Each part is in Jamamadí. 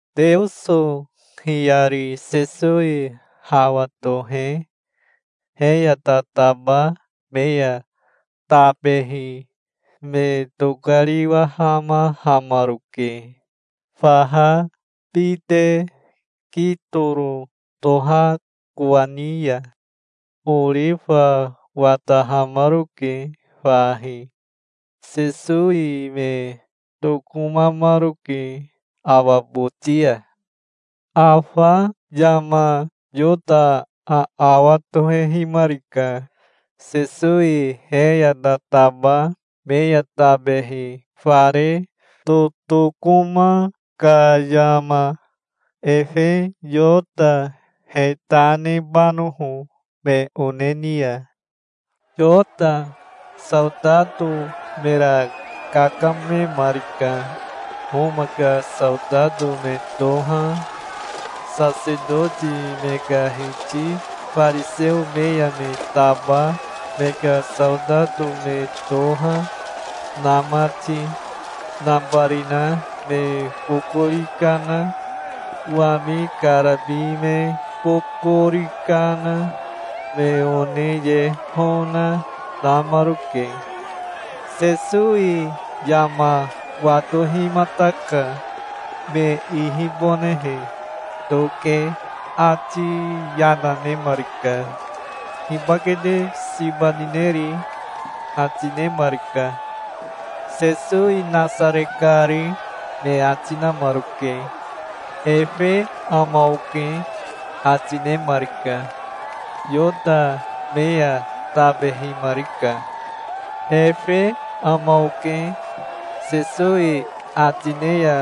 Teoso hiyari Sesowi hawa tohe he ya tataba me ya tabehi me tokariwahamahamaroke faha bite Kitoro toha kowani ya. Orifa watahamaroke fahi. Sesowi me tokomamaroke awa boti ya. Afa yama Yota aawa tohehimarika, Sesowi he ya tataba me ya tabehi fare totokoma ka yama, efe Yota he ta nebanoho me one ni ya. Yota saotato mera kakamemarika, Homa ka saotato me toha, sasetoti me ka hiti fariseo me ya me taba me ka saotato me toha, na mati. Nabarina me bokori kana, wami karabi me bokori kana, me one ye hona, namaroke. Sesowi yama watohimataka, me ihibonehe. Toke ati yana nemarika. "Hibake te siba nineri?" ati nemarika. "Sesowi Nasare kari", me ati namaroke. "Efe ama oke", ati nemarika. Yota me ya tabehimarika. "Efe ama oke", Sesowi ati ne ya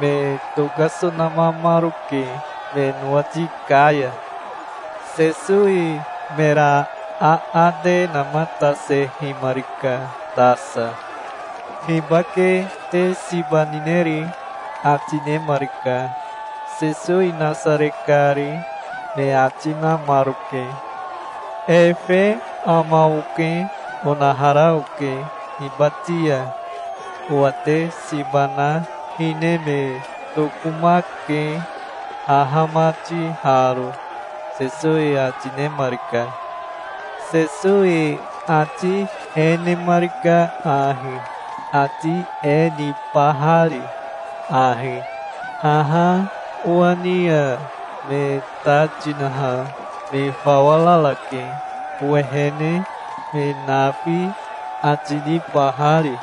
me tokasonamamaroke me nowati ka ya. Sesowi mera aate namatasehimarika tasa. "Hibake te siba nineri?" ati nemarika. "Sesowi Nasare kari", me ati namaroke. "Efe ama oke onahara oke hibati ya. Owa te siba na hine me tokomake, haha mati haro", Sesowi ati nemarika. Sesowi ati e nemarika ahi, ati e nibahari ahi, "Haha owa ni ya me ta tinaha me fawa rarake owehene, me nafi", ati nibahari.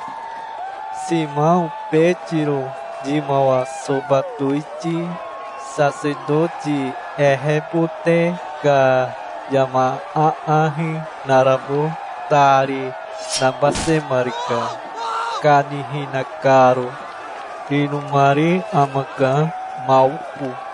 Simao Betiro yimawa soba towiti sasetoti ehebote ka yama aahi narabo tari nabasemarika, kanihina karo. Inomari amaka Maoko.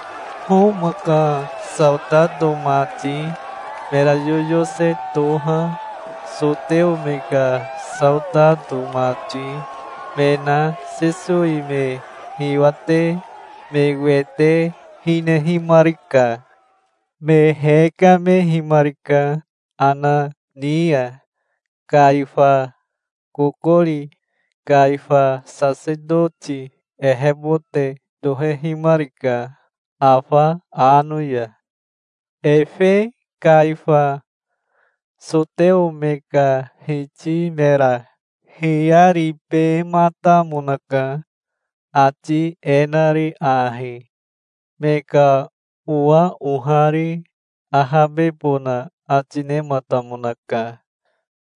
Homa ka saotato mati, mera yoyose toha, soteo me ka saotato mati, me na Sesowi me hiwate me wete hinehimarika. Me hekamehimarika Ana ni ya, Kaifa kokori. Kaifa sasetoti ehebote tohehimarika afa ano ya. Efe Kaifa soteo me ka hiti mera hiyaribematamonaka, ati e nari ahi: Me ka owa ohari ahabebona ati nematamonaka,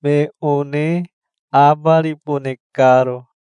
me one abaribone karo.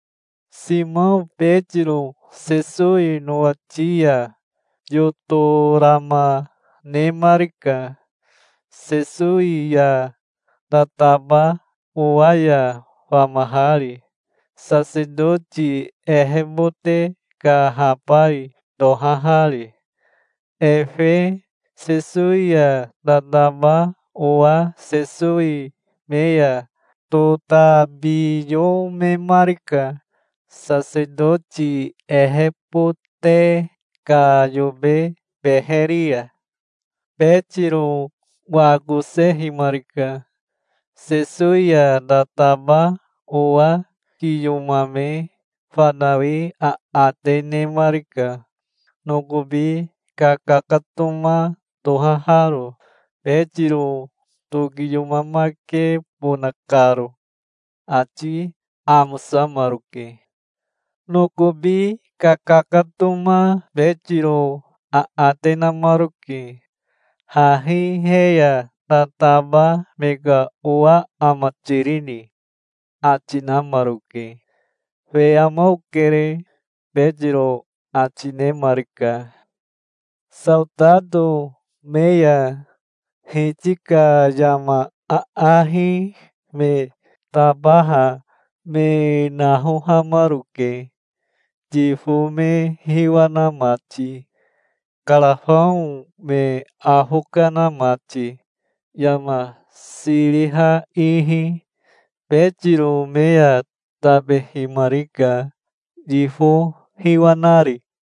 Simao Betiro Sesowi nowati ya yotorama nemarika, Sesowi ya tataba owa ya famahari, sasetoti ehebote ka habai tohahari. Efe Sesowi ya tataba owa Sesowi me ya totabiyomemarika, sasetoti ehebote ka yobe beheri ya. Betiro wakosehimarika. Sesowi ya tataba owa kiyomame fanawi aate nemarika, nokobi kakakatoma tohaharo, Betiro tokiyomamakebona karo. Ati amosamaroke. Nokobi kakakatoma Betiro aate namaroke. "Hahi he ya tataba me ka owa ama tirini?" ati namaroke. "Fe ama okere", Betiro ati nemarika. Saotato me ya hiti ka yama aahi me tabaha me nahohamaroke, yifo me hiwa na mati, karafao me afo kana mati, yama siriha ihi. Betiro me ya tabehimarika, yifo hiwa nari.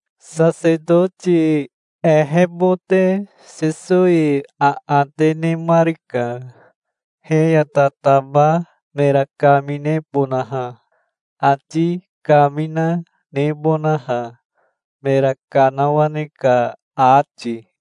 Sasetoti ehebote Sesowi aate nemarika, he ya tataba mera kaminebonaha, ati kamina nebonaha, mera kanawane ka ati.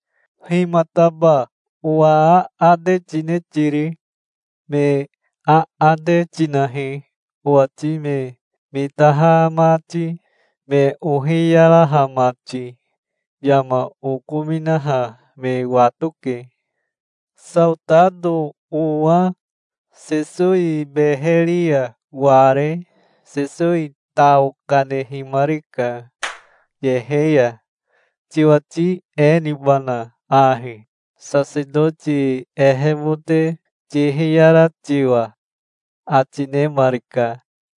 Himataba owa aate tine tiri? Me aate tinahi, owati me mitaha mati, me ohiyaraha mati. Yama okominaha me watoke". Saotato owa Sesowi beheri ya ware Sesowi tao kanehimarika yehe ya. "Tiwati e nibana ahi, sasetoti ehebote tihiyara tiwa?" ati nemarika.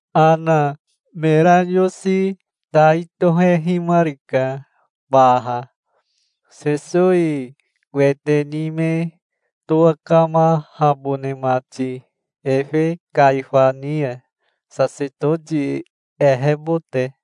Ana mera yosi tai tohehimarika baha, Sesowi wete ni me towakamahabone mati efe Kaifa ni ya, sasetoti ehebote.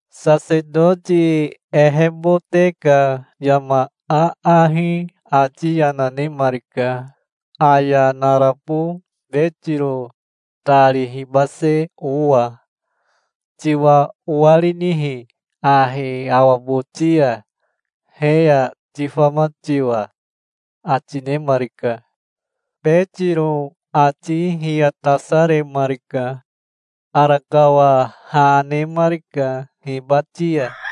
Sasetoti ehebote ka yama aahi ati yana nemarika, aya narabo Betiro tari hibase owa. "Tiwa owarinihi ahi awa boti ya, he ya tifama tiwa?" ati nemarika. Betiro ati hiyatasaremarika. Arakawa ha nemarika hibati ya.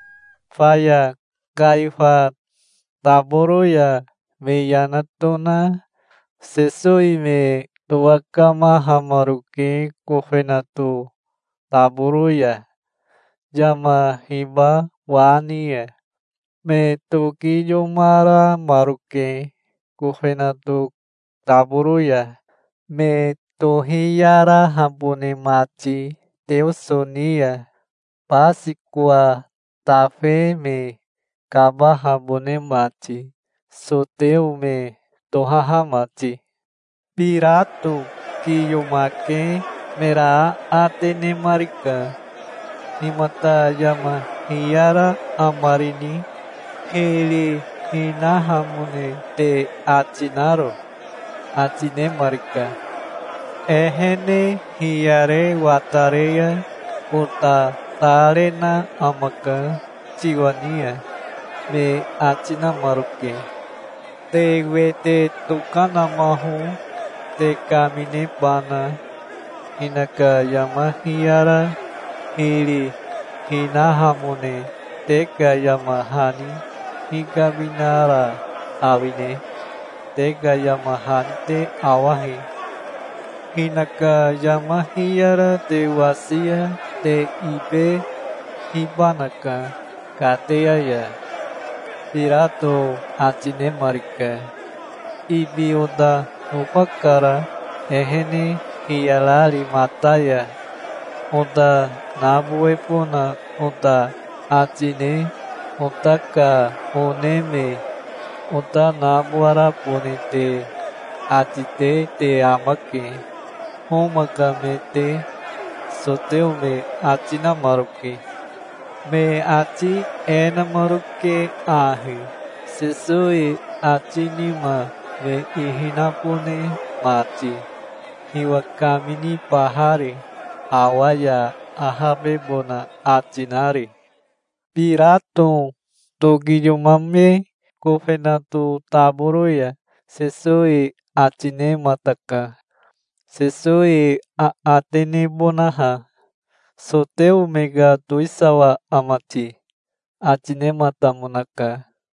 Faya Kaifa taboro ya me yana tona Sesowi me towakamahamaroke kofenato taboro ya, yama hiba wa ni ya. Me tokiyomaramaroke kofenato taboro ya, me tohiyarahabone mati Teoso ni ya, Basikowa tafe me kabahabone mati, soteo me tohaha mati. Birato kiyomake mera aate nemarika. "Himata yama hiyara amarini, hiri hinahamone te ati naro?" ati nemarika. "Ehene hiyare watare ya ota ta rena amaka tiwa ni ya", me ati namaroke. "Te wete tokanamaho, te kaminebana. Hinaka yama hiyara hiri hinahamone te ka yama hani hikaminara awine? Te ka yama hani te awahi. Hinaka yama hiyara te wasi ya te ibehibanaka kateya ya", Birato ati nemarika. "Ibi ota nofakara, ehene hiyarari mata ya. Ota nabowebona ota ati ne ota ka one me ota nabowarabone te ati te te amake, Homa ka me te", soteo me ati namaroke. Me ati e namaroke ahi, Sesowi ati nima me ihi nabone mati, hiwa kaminibahari, awa ya ahabebona ati nari. Birato tokiyomame kofenato taboro ya Sesowi ati nemataka, Sesowi aate nebonaha. "Soteo me ka towisawa ama ti?" ati nematamonaka.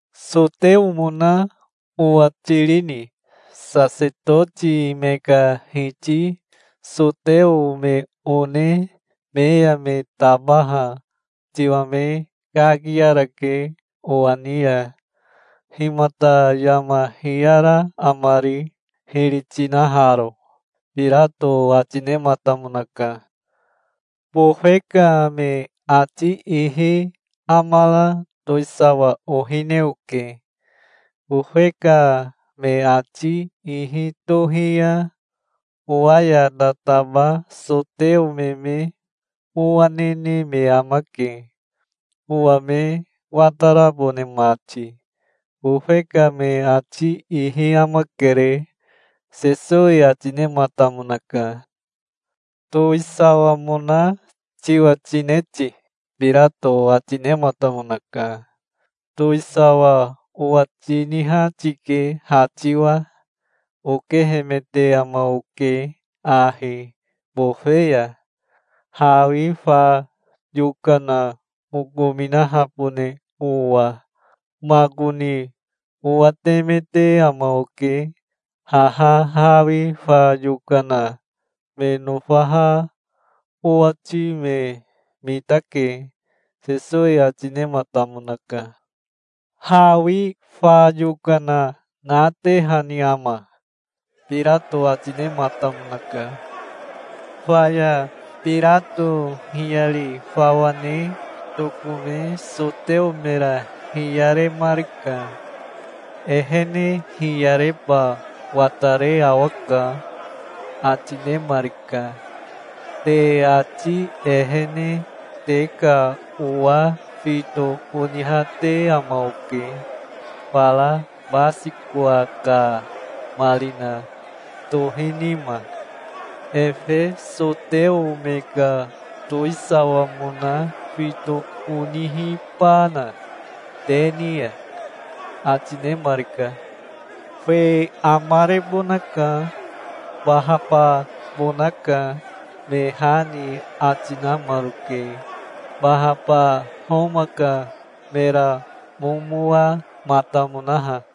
"Soteomona owa tirini? Sasetoti me ka hiti soteo me one me ya me tabaha tiwa me kakiarake owa ni ya. Himata yama hiyara amari, hiri tinaharo?" Birato ati nematamonaka. "Bofe ka me ati ihi amara towisawa ohine oke. Bofe ka me ati ihi tohi ya owa ya tataba soteo me me mowa nene me amake, owa me watarabone mati. Bofe ka me ati ihi amakere", Sesowi ati nematamonaka. "Towisawamona tiwa tine ti?" Birato ati nematamonaka. "Towisawa owa tiniha tike ha tiwa. Okehemete ama oke ahi bofe ya, hawi fa yokana okominahabone owa. Makoni owatemete ama oke. Haha hawi fa yokana me nofaha owati me mitake", Sesowi ati nematamonaka. "Hawi fa yokana natehani ama?" Birato ati nematamonaka. Faya Birato hiyari fawa ne tokome soteo mera hiyaremarika. "Ehene hiyareba watare awaka", ati nemarika. "Te ati ehene te ka owa fito onihate ama oke fara Basikowa ka marina tohi nima. Efe soteo me ka towisawamona fito onihibana te ni ya?" ati nemarika. "Fe amarebonaka. Bahababonaka", me ha ni ati namaroke, Bahaba Homa ka mera momowamatamonaha.